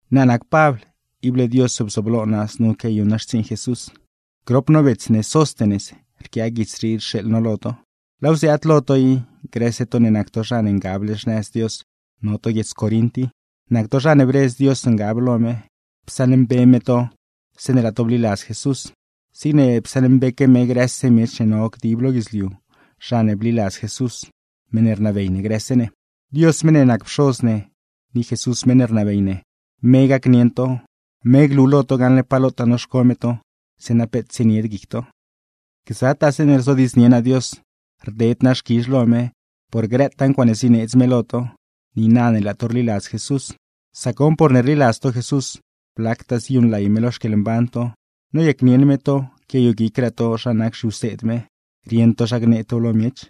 Naa nac Pabl, ible Dios bzooblo naa znu quiayuṉ naa xtsiiṉ Jesús. Grop no bets ne Sóstenes rquiaa guits rii rxeeḻ no lo to. Laaw ziaad lo to i, grëse to ne nac to zha ne ngable xnëz Dios no to guiedz Corint i, nac to zha ne bredz Dios ngab lo me, psaṉmbe me to zeeṉe laa to bliladz Jesús; zigne psaṉmbeque me grëse miech ne no dib lo guidzliu, zha ne bliladz Jesús, meṉ ne rnabey ne grëse ne. Dios meṉ ne nac Pxoz ne, ni Jesús meṉ ne rnabey ne, me gacnieṉ to, me glu lo to gaṉle pa lotaa noxco me to; zeeṉa peet tsienied guic to. Gzataa zeeṉe rzodiidznie naa Dios, rded naa xquizh lo me por grëtaa ncuaaṉe zineedz me lo to, niina ne laa to rliladz Jesús. Sac goṉ porne rliladz to Jesús, blactaa ziyuṉlay me lo xquieḻmban to, noyacnieṉ me to quiayoguicraa to zha nac zhiwseed me, rieṉ to zha gnee tow lo miech.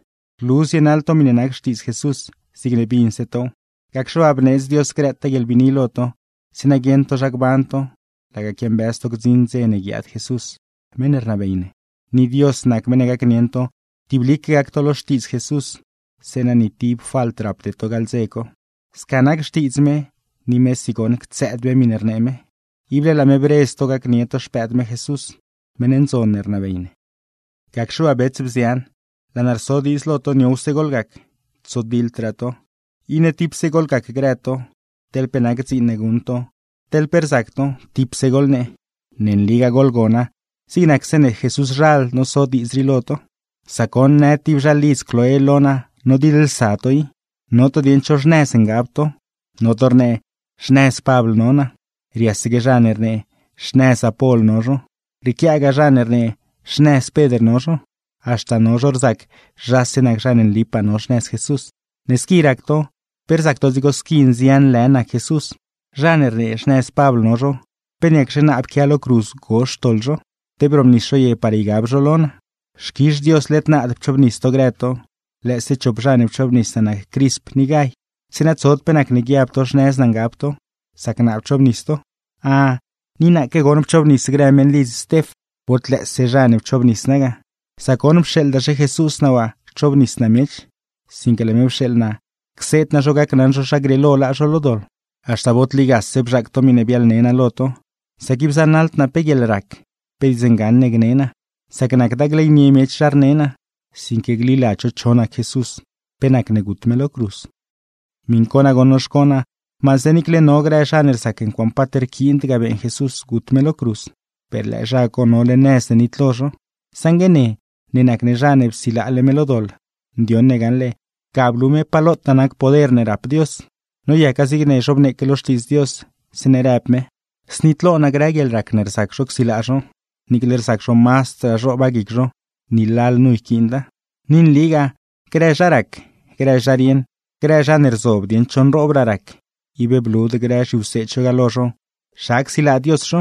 Rlu zienaḻ to miṉe nac Xtiidz Jesús, zigne binse tow, gacxe waa bneedz Dios grëtaa guieḻbiini lo to, zeeṉa guieṉ to zha gban to, laga quiambëz to gdziṉ dze ne guiaad Jesús meṉ ne rnabey ne. Ni Dios nac meṉ ne gacnieṉ to tiblique gac to lo Xtiidz Jesús, zeeṉa ni tib falt rapde to gaḻ dze co. Sca nac xtiidz me, ni mesi goṉ ctsëëd me miṉe rnee me, ible laa me bredz to gacnie to Xpëëd me Jesús, meṉ ndzon ne rnabey ne. Gacxe waa bets, bzian, laa naa rso diidz lo to niowse goḻgac, tsodiḻdraa to. Iṉe tipse goḻgac grë to, teḻ pe nac dziin ne guṉ to, teḻ pe rzac to, tipse goḻnee. Ne nligaa goḻgona, zig nac zeeṉe Jesúszhal noso diidz rii lo to. Sac goṉ në tib zhalidz Cloé lo naa nodiḻlsa to i; no to dieṉ cho xnëz ngab to. No to rnee: “Xnëz Pabl no naa”; riasaque zha ne rnee xnëz Apol no zho, rrieequiagaa zha ne rnee xnëz Pedr no zho; haxta no zho rzac zhase nac zha ne nlipaa no xnëz Jesús. Ne squi rac to, ¿pe rzac to dzigo squi nzian lë nac Jesús? Zha ne rnee xnëz Pabl no zho, ¿pe niacxe naa pquia lo cruz gozh xtoḻ zho?, ¿te brobnis zho ye par ygab zho lo naa? ¡Xquizh Dios led naad pchoobnis to grë to, lëëse chop zha ne pchoobnis naa nac Crisp ni Gay! Zeeṉa tsod pe nacne guiab to xnëz naa ngab to, sac naa pchoobnis to. Ah, ni naaque goṉ pchoobnis grë meṉlidz Stef. Bod lëëse zha ne pchoobnis naa ga, sac goṉ pxeeḻdaxe Jesús naa waa cchoobnis naa miech, sinque laa me pxeeḻ naa cseed naa zho gacnaṉ zho zha grieelo laa zho lo doḻ. Haxta bod ligase bzhaac to miṉe biaḻne naa lo to, sac ib zanaḻd naa pe guieḻrac, pe diidz ngaṉ ne gne naa; sac nacda gleynie miech zha rnee naa, sinque gliladz zho cho nac Jesús, pe nacne gut me lo cruz. Miṉ co nagoṉ noxco naa, maase niicle no grë zha ne rzac ncuaaṉe paat rquiind ga beeṉ Jesús gut me lo cruz, per lëë zha co nole nëz ne nitlo zho; saṉgue ne ne nac ne zha ne psilaale me lo doḻ, ndioṉ ne gaṉle ga blu pa lotaa nac poder ne rap Dios. Noyaca zigne zhobneeque lo Xtiidz Dios, zeeṉe rëb me: Znitlo naa grë guieḻrac ne rzac zho csilaa zho, niicle rzac zho mazdraa zhooba guic zho, ni lalnu yquiinda. Ni nligaaw, grë zha rac, grë zha rieṉ, grë zha ne rzob dieṉ cho nroobraa rac, ib blud grë zhiwseed zho ga lo zho zha csilaa Dios zho,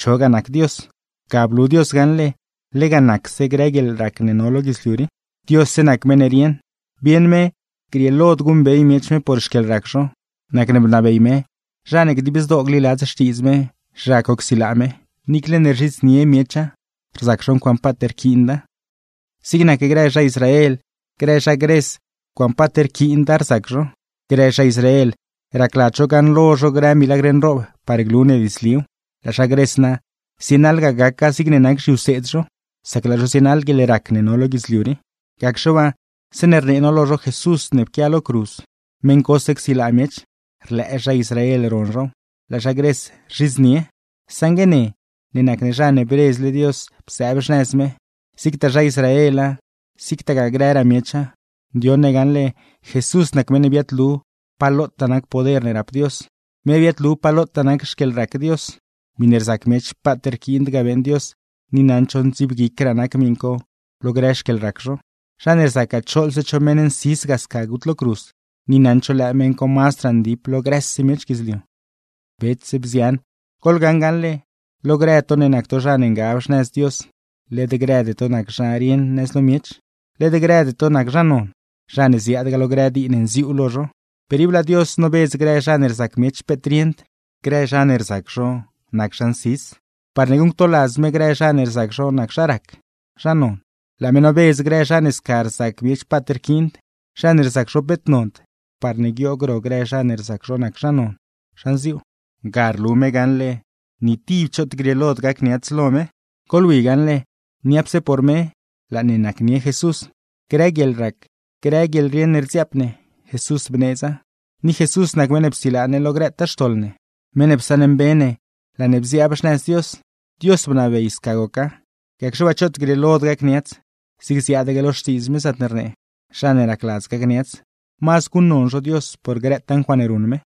chogaa nac Dios. Ga blu Dios gaṉle lega nacse grë guieḻrac ne no lo guidzliu rii. ¡Diosse nac meṉ ne rieṉ! Bieṉ me grieelod guṉbey miech me por xquieḻrac zho, nacne bnabey me zha ne dib zdoo gliladz xtiidz me, zha co csilaa me; niicle ne rzhidznie miecha, rzac zho ncuaaṉe paat rquiinda. Zig nac grë zha Israel, grë zha Gres ncuaaṉe paat rquiinda rzac zho. Grë zha Israel, racladz zho gaṉlo zho grë milagr nroob par glu ne diidzliw; laa zha Gres na zienaḻgaa gaca zigne nac zhiwseed zho, sac laa zho zienaḻ guieḻrac ne no lo guidzliu rii. Gacxe waa zeeṉe rnee no lo zho Jesús meṉ ne pquia lo cruz, meṉ cose csilaa miech, rlëë zha Israel ron zhow; laa zha Gres, rzhidznie. Saṉgue ne, ne nac ne zha ne bredzle Dios bzëëb xnëz me, zigtaa zha Israela, zigtagaa grëraa miecha, ndioṉ ne gaṉle Jesús nac meṉ ne biaadlu pa lotaa nac poder ne rap Dios, me biaadlu pa lotaa nac xquieḻrac Dios. Miṉe rzac miech paat rquiind ga beeṉ Dios, ni naṉd zho ndziibguicraa nac miṉ co lo grë xquieḻrac zho; zha ne rzacgaa choḻze cho meṉ nsis ga sca gut lo cruz, ni naṉd zho lëë meṉ co mazdraa ndip lo grëse miech guidzliu. Bets, bzian, goḻgaṉ gaṉle lo grë to ne nac to zha ne ngab xnëz Dios, led grëde to nac zha rieṉ nëz lo miech, led grëde to nac zha non, zha ne ziaadgaa lo grë dii ne nziuu lo zho. Per ib laa Dios nobedz grë zha ne rzac miech peet rieṉd, grë zha ne rzac zho nac zha nsis, parne guṉctoladz me grë zha ne rzac zho nac zha rac, zha non. Laa me nobedz grë zha ne sca rzac miech paat rquiin, zha ne rzac zho peet nond, parne guioog ro grë zha ne rzac zho nac zha non, zha nziuu. Ga rlu me gaṉle ni tib choot grieelod gacniats lo me. Goḻwi gaṉle, niapse por me laa ne nacnie Jesús, grë guieḻrac, grë guieḻrieṉ ne rdziaap ne, Jesús bneedza, ni Jesús nac meṉ ne psilaa ne lo grëtaa xtoḻ ne, meṉ ne psaṉmbe ne laa ne bziaab xnëz Dios. Dios bnabey sca goca. Gacxe waa choot grieelod gacniats, zigne ziaadaque lo Xtiidz me zaatne rnee: “Zha ne racladz gacniats, mazd guṉnon zho Dios por grëtaa ncuaaṉe ruṉ me.”